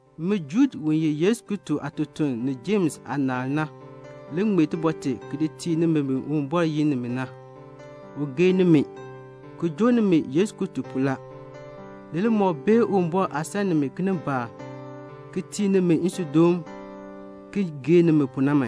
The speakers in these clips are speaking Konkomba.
Min Juud, u ye Yesu Kristo aatutuln, ni Jems aanaal na le ŋmee tibɔr tee ki di tii nimi bi Uwumbɔr yin nimi na. U gee nimi, ki joo nimi Yesu Kristo pu la. Ni li moo bee Uwumbɔr aah san nimi kinimbaak, ki tii nimi nsuudoon, ki gee nimi pu na.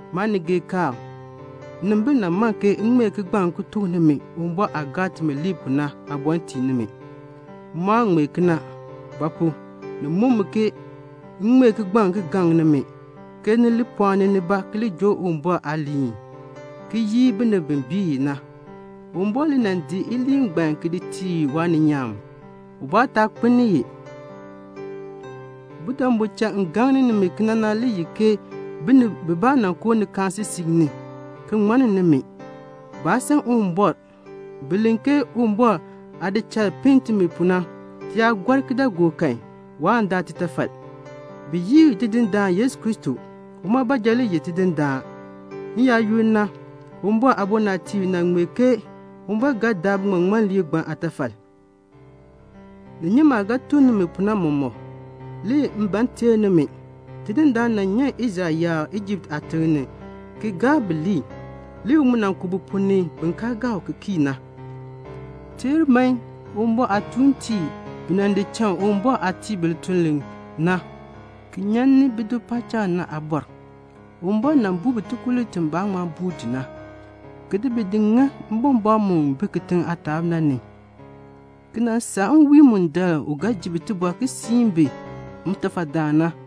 Maanigeekaan, nnimbil nan man ke m ŋmee timi aaŋmarm aabɔr ki di tii nimi. M mu aa ŋmee kena; ba pu? ni muk mi ke m ŋmee kigbaŋ ki gaŋ nimi ke ni li pɔɔni nibaa ki li joo Uwumbɔr aaliin, ki yii binib bi bii i na. Uwumbɔr le nan di iliin ngbaan ki di tii waaninyaan. Ubaa taa kpeln i. Budabu cha m gaŋni nimi kena na le ye ke binib bibaa nan koo ni nikaasisik ni, ki ŋmanni nimi. Baa san Uwumbɔr. Bi len ke Uwumbɔr aah di cha pinn timi pu na, ti yaa gɔr kidaagook kan, waan daa titafal. Bi yii Tidindaan Yesu Kristo. Uma baanja le ye Tidindaan. N-yaayoonn na, Uwumbɔr aabɔnabtiib nan ŋmee ke Uwumbɔr ga daa biŋmaŋmanliib ngbaan aatafal. Ni nyi maah ga tuk nimi pu na mɔmɔk. Le m ban m teer nimi. Tidindaan nan nyan Israel yaab Ijipt aatiŋ ni aan bi ŋmar. Le u mu ku bi ponn ni bin kaa gaa u ki kii na. Teer man, Uwumbɔr aatuuntiib bi nan di cha Uwumbɔr aah tii bi lituln li na, ki nyan ni bido paacham na. Uwumbɔr nan buu bi tikululn ti baan ŋma buur ti na, ki di bi ki di ŋa mbɔmbɔɔn mu bi kitiŋ aataab na ni, ki nan saa nwiin mundaln u ga ji bi tibɔr ki siin bi ntafadaan na.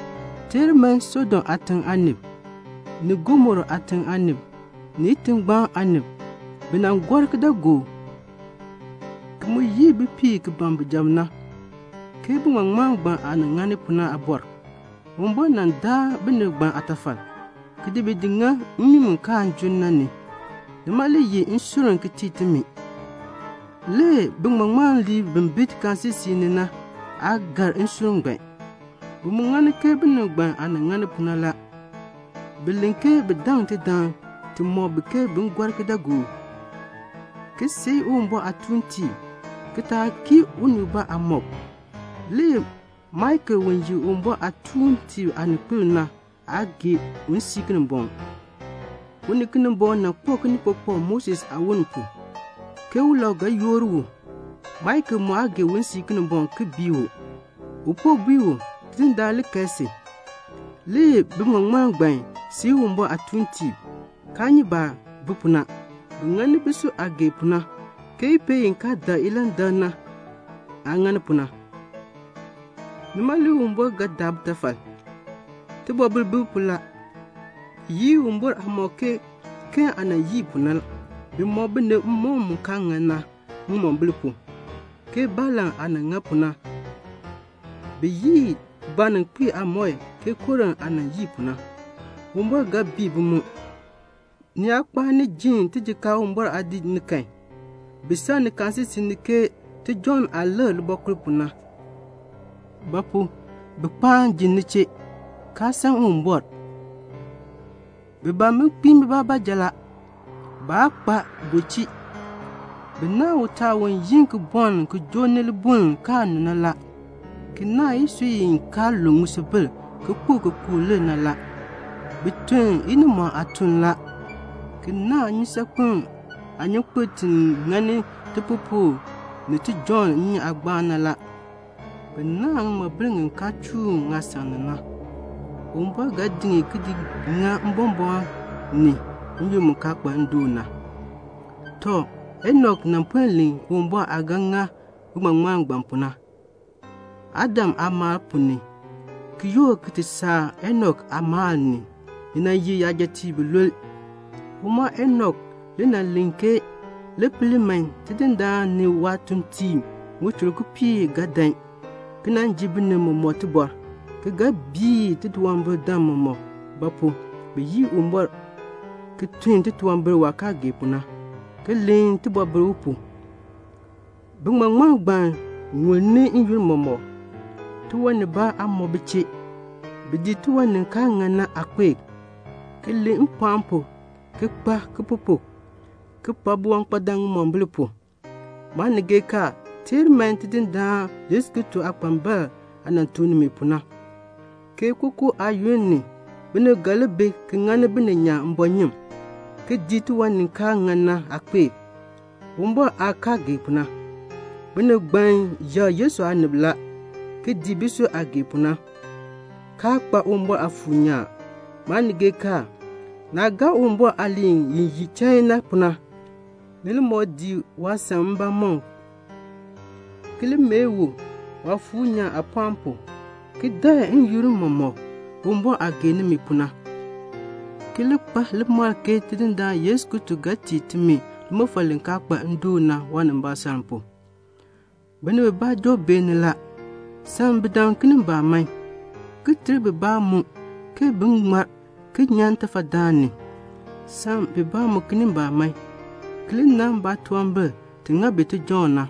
Teer man, Sodom aatiŋ aanib, ni Gomora aatiŋ aanib, ni itingbaan aanib, bi nan gɔr kidaagook, ki mu yii bipiib ki ban bijab na, ke biŋmaŋmanliib ngbaan aah ŋani pu na. Uwumbɔr nan daa binib ngbaan aatafal, ki di bi ki ŋa mmii mu kaan junn na ni. Nima le ye nsurm ki tii timi. Le biŋmaŋmanliib bi bi nikaasisik ni na, baa gar nsurm ngbaan. Bi mu ŋani ke binib ngbaan aah nan ŋani pu na la. Bi len ke bi daŋ tidaŋ ti mɔk bi ke bin gɔr kidaagook, ki seei Uwumbɔr aatuuntiib, ki taa kii unii ubaa aamɔb. Le Maikel u ye Uwumbɔr aatuuntiib aaninkpil na, waa gee un sii Kinimbɔŋ. U ni Kinimbɔŋ nan kpak kinikpakpak Moses aawon pu, ke ulau ga yoor u. Maikel mu aa gee un sii Kinimbɔŋ ki bii u. U po bui u, "Tidindaan li kae si." Le biŋmaŋmanliib ngbaan seei Uwumbɔr aatuuntiib, kaa nyi baah bi pu na. Bi ŋani bisui aah gee pu na, ke ipeel i kaa dak ilandak na aah ŋani pu na la. Nima le Uwumbɔr ga daa bitafal. Tibɔbil bi bi pu la. Bi yii Uwumbɔr aamɔb ke Keen aah nan yii pu na. Bi mɔk binib mmɔkm mu kaa ŋan na ŋimombil pu, ke Balaam aah nan ŋa pu na. Bi yii baaninkpiib aamɔi ke Kora aah nan yii pu na. Uwumbɔr ga bii bi mu. Ni yaa kpaan ni ji tijikaar Uwumbɔr aadiik ni kan, bi sak nikaasisik ni ke tijɔŋ aah likr libɔkul pu na; ba pu? bi kpaan ji ni chee, kaa san Uwumbɔr. Bi ban bin kpiin bibaa baanja la. Baa kpa bulchii. Bi naahn utaal u yu ki bɔln ki joo libuln kaa nu na; ki naahn isui i kaa lu ŋisubil ki kpo ki kpukr lir na la. Bi tun inimɔɔn aatuln la, ki naahn nnyusaakpem aanyunkpeln ti ŋa tipupukr ni tijɔŋ nnyun aagbaan na. Bi naahn ŋiŋmabil ŋi kaa chuun ŋaasan ni na. Uwumbɔr ga di bi ki di ŋa mbɔmbɔɔn ni, n-yoonn mu kaa kpa ndoon na. Tɔ, Enok nan puen len Uwumbɔr aah ga ŋa biŋmaŋmanliib ngbaan pu na; (Adam aamaal ponn ni ki yoor ki ti saa Enok aamaal ni na nan ye yajatiib bilule.) Uma Enok le nan len ke "Li pel man, Tidindaan ni waatuuntiib ŋichur kipiik ga dan ki nan ji binib mɔmɔk tibɔr, ki ga bii titunwambirdam mɔmɔk; ba pu? bi yii Uwumbɔr, ki tun titunwambir waah kaa gee pu na, ki len tibɔbil u pu." Biŋmaŋmanliib ngbaan ŋulni n-yoonn mɔmɔk; tiwan nibaa aa mɔ bi chee. Bi dii tiwan ni kaa ŋan na aakpeek, ki len mpɔɔn pu ki nyu baalaa, ki pak biwankpadam ŋimombil pu la. Maanigeekaan, teer man Tidindaan Yesu Kristo aakpambalb aah nan tuk nimi pu na, ke kookoo aayoonn binib ga li bi ki ŋani bininyaan mbɔɔnyun, ki dii tiwan ni kaa ŋan na aakpeek, Uwumbɔr aah kaa gee pu na. Binib ngbaan yakr Yesu aanib la, ki dii bisui aah gee pu na, kaa kpa Uwumbɔr Aafuur nyaan. Maanigeekaan, naah gaa Uwumbɔr aaliin i ye chain na pu na, ni li moo dii waasan mbamɔm, ki li mee u Waafuur nyaan aapɔɔn pu, ki dakl n-yoonn mɔmɔk Uwumbɔr aah gee nimi pu na, ki li kpa limakl ke Tidindaan Yesu Kristo ga tii timi limɔfal li kaa kpa ndoon na, waanimbaasaln pu. Binib bibaa joo beeni la. Sam bidam kinimbaak man, ki ter bibaa mu ke bin ŋmar ki nyan ntafadaan ni. Sam bibaa mu kinimbaak man, ki li nan baatunwambir ti ŋa bi tijɔŋ na,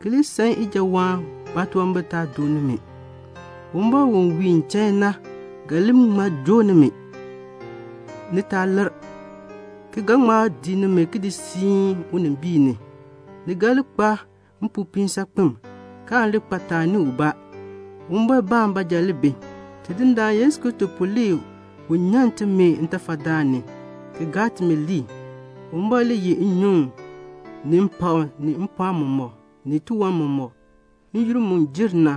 ki li san ijawaan baatunwambir taa doo nimi. Uwumbɔr u wiin chain na ga li ŋma joo nimi, ni taa lir, ki ga ŋma di nimi ki di siin unimbiin ni. Ni ga li kpa mpopiin saakpen, kaan li kpa taani ubaa. Uwumbɔrbaan baanja le bi. Tidindaan Yesu Kristo pu le u nyan timi ntafadaan ni, le ti ŋmar. Uwumbɔr le yeh nnyuŋ, ni mpakm, ni mpɔɔn mɔmɔk, ni tiwan mɔmɔk, n-yoonn mu jer na,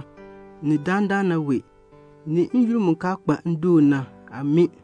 ni dandana wee, ni n-yoonn mu kaa kpa ndoon na. Amii.